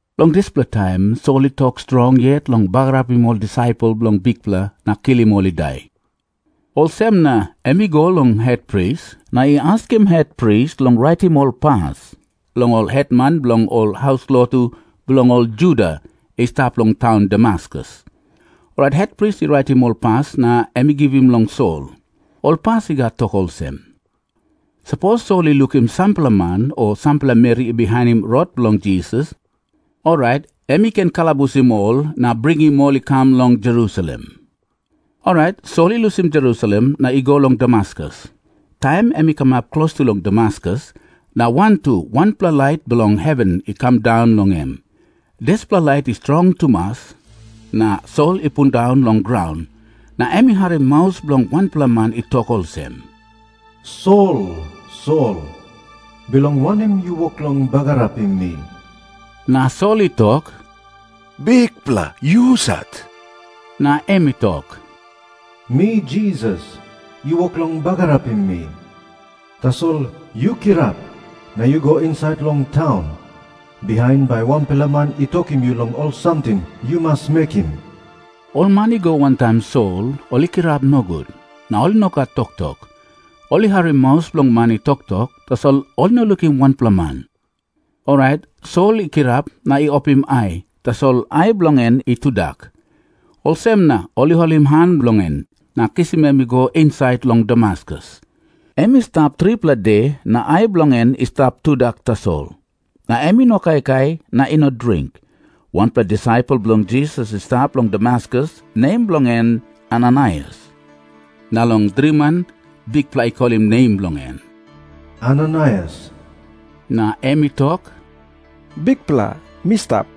Long dispela taim Sol i tok strong yet long bagarapim ol disaipel bilong Bikpela na kilim ol i dai. Olsem na em i go long hetpris, na i askim hetpris long raitim ol pas long ol hetman bilong ol haus lotu bilong ol Juda i stap long taun Damaskus. Orait hetpris i raitim ol pas na em i givim long Sol. Ol pas i gat tok olsem, “Sapos Sol i lukim sampela man o sampela meri i bihainim rot bilong Jisas, orait em i ken kalabusim ol na bringim ol i kam long Jerusalem.” Orait Sol i lusim Jerusalem na i go long Damaskus. Taim em i kamap klostu long Damaskus, na wantu wanpela lait bilong heven i kam daun long em. Dispela lait i strong tumas na Sol i pundaun long graun. Na em i harim maus bilong wanpela man i tok olsem, “Sol, Sol, bilong wanem yu wok long bagarapim mi?” Na Sol i tok, “Bikpela, yu husat?” Na em i tok, “Mi Jisas, yu wok long bagarapim mi. Tasol yu kirap na yu go insait long taun. Bihain bai wanpela man i tokim yu long ol samting yu mas mekim.” Ol man i go wantaim Sol ol i kirap nogut, na ol i no gat toktok. Ol i harim maus bilong man i toktok, tasol ol i no lukim wanpela man. Orait Sol i kirap na i opim ai, tasol ai bilong en i tudak. Olsem na ol i holim han bilong en na kisim em i go insait long Damaskus. Em i stap tripela de, na ai bilong en i stap tudak tasol. Na em i no kaikai na i no dring. Wanpela disaipel bilong Jisas i stap long Damaskus, nem bilong en Ananaias. Na long driman Bikpela i kolim nem bilong en, “Ananaias.” Na em i tok, “Bikpela, mi stap.”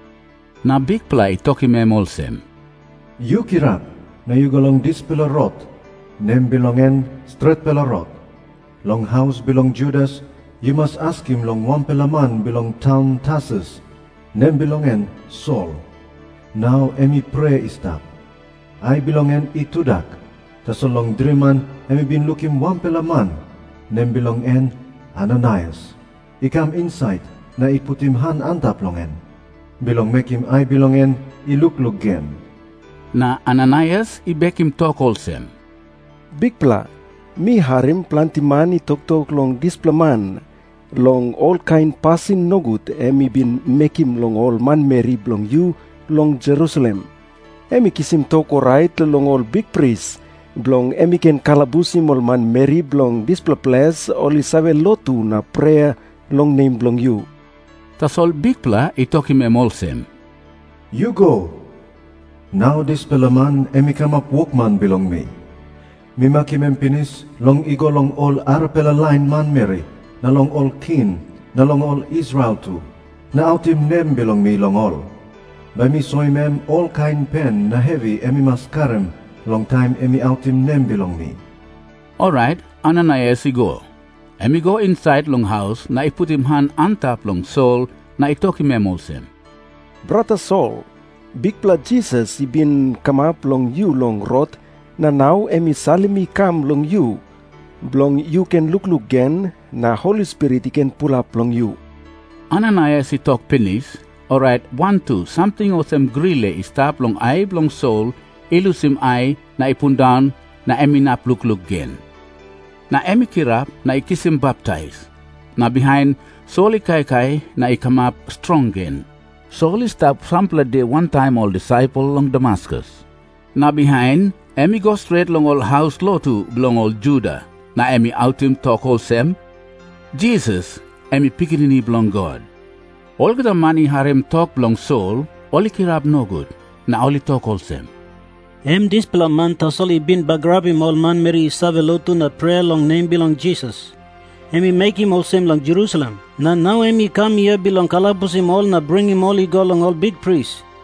Na Bikpela i tokim em olsem, “Yu kirap na yu go long dispela rot, nem bilong en Stretpela Rot. Long haus bilong Judas yu mas askim long wanpela man bilong taun Tarsus, nem bilong en Sol. Nau em i prea i stap. Ai bilong en i tudak, tasol long driman em i bin lukim wanpela man, nem bilong en Ananaias, i kam insait na i putim han antap long en, bilong mekim ai bilong en i lukluk gen.” Na Ananaias i bekim tok olsem, “Bikpela, mi harim planti man i toktok long dispela man, long olkain pasin nogut em i bin mekim long ol manmeri bilong yu long Jerusalem. Em i kisim tok orait long ol bikpris, bilong em i ken kalabusim ol manmeri bilong dispela ples ol i save lotu na prea long nem bilong yu.” Tasol Bikpela i tokim em olsem, “Yu go. Nau dispela man em i kamap wokman bilong mi. Mi makim em pinis long i go long ol arapela lain manmeri na long ol king, na long ol Israel tu, na autim nem bilong mi long ol. Bai mi soim em olkain pen na hevi em i mas karim long taim em i autim nem bilong mi.” Orait Ananaias i go. Em i go insait long haus, na i putim han antap long Sol na i tokim em olsem, “Brata Sol, Bikpela Jisas i bin kamap long yu long rot, na nau em i salim mi i kam long yu, bilong yu ken lukluk gen na Holi Spirit i ken pulap long yu.” Ananaias i tok pinis, orait wantu samting olsem grile i stap long ai bilong Sol i lusim ai na i pundaun na em inap lukluk gen. Na em i kirap na i kisim baptais. Na bihain Sol i kaikai na i kamap strong gen. Sol i stap sampela de wantaim ol disaipel long Damaskus. Na bihain em i go stret long ol haus lotu bilong ol Juda, na em i autim tok olsem, “Jisas em i Pikinini Bilong God.” Olgeta man i harim tok bilong Sol, ol i kirap nogut. Na ol i tok olsem, “Em dispela man tasol i bin bagarapim ol manmeri i save lotu na prea long nem bilong Jisas. Em i mekim olsem long Jerusalem, na nau em i kam hia bilong kalabusim ol na bringim ol i go long ol bikpris.”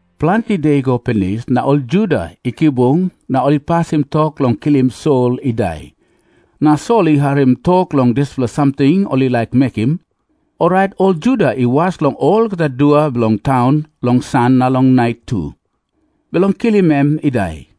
Planti de i go pinis, na ol Juda i kibung na ol i pasim tok long kilim Sol i dai. Na Sol i harim tok long dispela samting ol i laik mekim. Orait ol Juda i was long olgeta dua bilong taun long san na long nait tu, bilong kilim em i dai.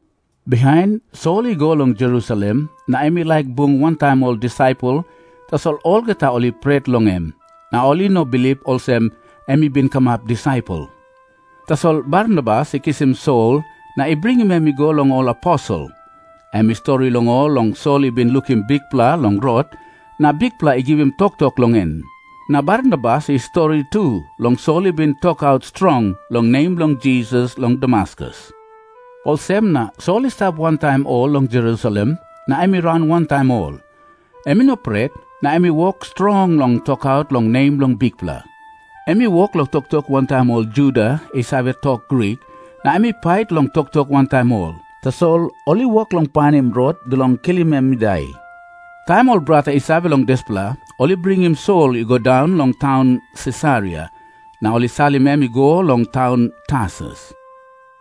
Bihain Sol i go long Jerusalem, na em i laik bung wantaim ol disaipel. Tasol olgeta ol i pret long em, na ol i no bilip olsem em i bin kamap disaipel. Tasol Barnabas i kisim Sol na i bringim em i go long ol aposel. Em i stori long ol long Sol i bin lukim Bikpela long rot, na Bikpela i givim toktok long em. Na Barnabas i stori tu long Sol i bin tokaut strong long nem bilong Jisas long Damaskus. Olsem na Sol i stap wantaim ol long Jerusalem na em i raun wantaim ol. Em i no pret, na em i wok strong long tokaut long nem bilong Bikpela. Em i wok long toktok wantaim ol Juda i save tok Grik, na em i pait long toktok wantaim ol. Tasol ol i wok long painim rot bilong kilim em i dai. Taim ol brata i save long dispela, ol i bringim Sol i go daun long taun Sisaria, na ol i salim em i go long taun Tarsus.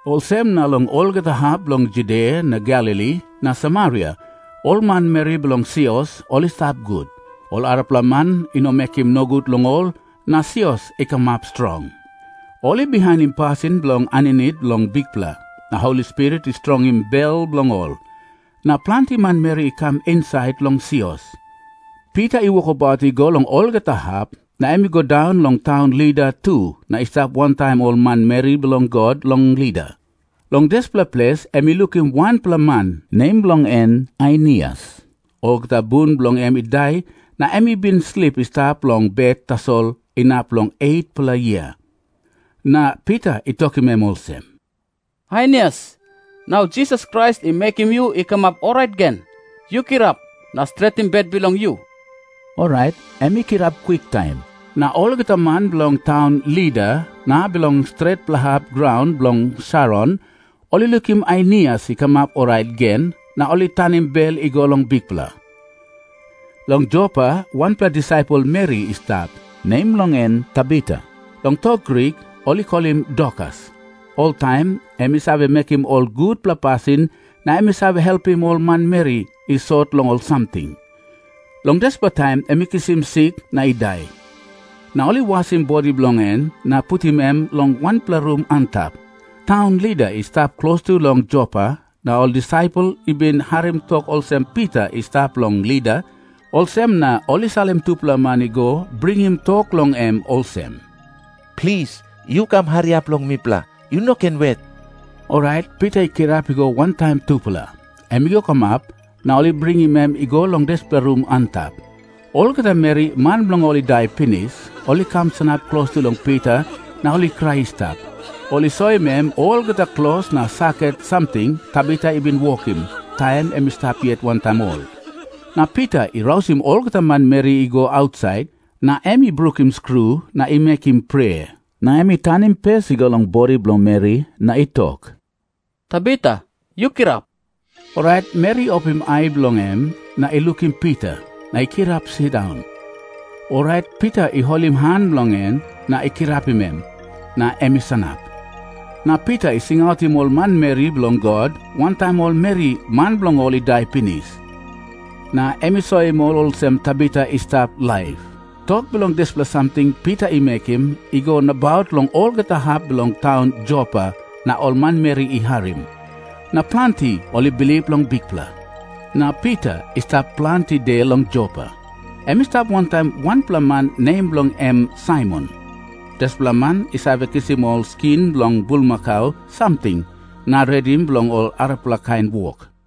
Olsem na long olgeta hap bilong Judia na Galili na Samaria ol manmeri bilong sios, ol i stap gut. Ol arapela man i no mekim nogut long ol, na sios i kamap strong. Ol i bihainim pasin bilong aninit long Bikpela, na Holi Spirit i strongim bel bilong ol. Na planti manmeri i kam insait long sios. Pita i wokabaut i go long olgeta hap, na em i go daun long taun Lida tu na i stap wantaim ol manmeri bilong God long Lida. Long dispela ples em i lukim wanpela man, nem bilong en Ainias. Olgeta bun bilong en i dai, na em i bin slip i stap long bet tasol inap long 8-pela yia. Na Pita i tokim em olsem, “Ainias, nau Jisas Krais i mekim yu i kamap orait gen. Yu kirap na stretim bet bilong yu.” Orait em i kirap kwiktaim. Na olgeta man bilong taun Lida na bilong stretpela hap graun bilong Saron, ol i lukim Ainias i kamap orait gen, na ol i tanim bel i go long Bikpela. Long Jopa wanpela disaipel meri i stap, nem bilong en Tabita. Long tok Grik ol i kolim Dorkas. Oltaim em i save mekim ol gutpela pasin na em i save helpim ol manmeri i sot long ol samting. Long dispela taim em i kisim sik na i dai. Na ol i wasim bodi bilong en na putim em long wanpela rum antap. Taun Lida i stap klostu long Jopa, na ol disaipel i bin harim tok olsem Pita i stap long Lida. Olsem na ol i salim tupela man i go bringim tok long en olsem, “Plis, yu kam hariap long mipela. Yu no ken wet.” Orait Pita i kirap i go wantaim tupela. Em i go kamap, na ol i bringim em i go long dispela rum antap. Olgeta meri, man bilong ol i dai pinis, ol i kam sanap klostu long Pita na ol i krai i stap. Ol i soim em olgeta klos na saket samting Tabita i bin wokim, taim em i stap yet wantaim ol. Na Pita i rausim olgeta manmeri i go ausait, na em i brukim skru na i mekim prea. Na em i tanim pes i go long bodi bilong meri na i tok, “Tabita, yu kirap.” Orait meri i opim ai bilong en, na i lukim Pita, na i kirap sindaun. Orait Pita i holim han bilong en na i kirapim em, na em i sanap. Na Pita i singautim ol manmeri bilong God, wantaim ol meri, man bilong ol i dai pinis, na em i soim ol olsem Tabita i stap laip. Tok bilong dispela samting Pita i mekim i go nabaut long olgeta hap bilong taun Jopa, na ol manmeri i harim. Na planti ol i bilip long Bikpela. Na Pita i stap planti de long Jopa. Em i stap wantaim wanpela man nem bilong en Saimon. Dispela man i save kisim ol skin bilong bulmakau samting na redim bilong ol arapela kain wok.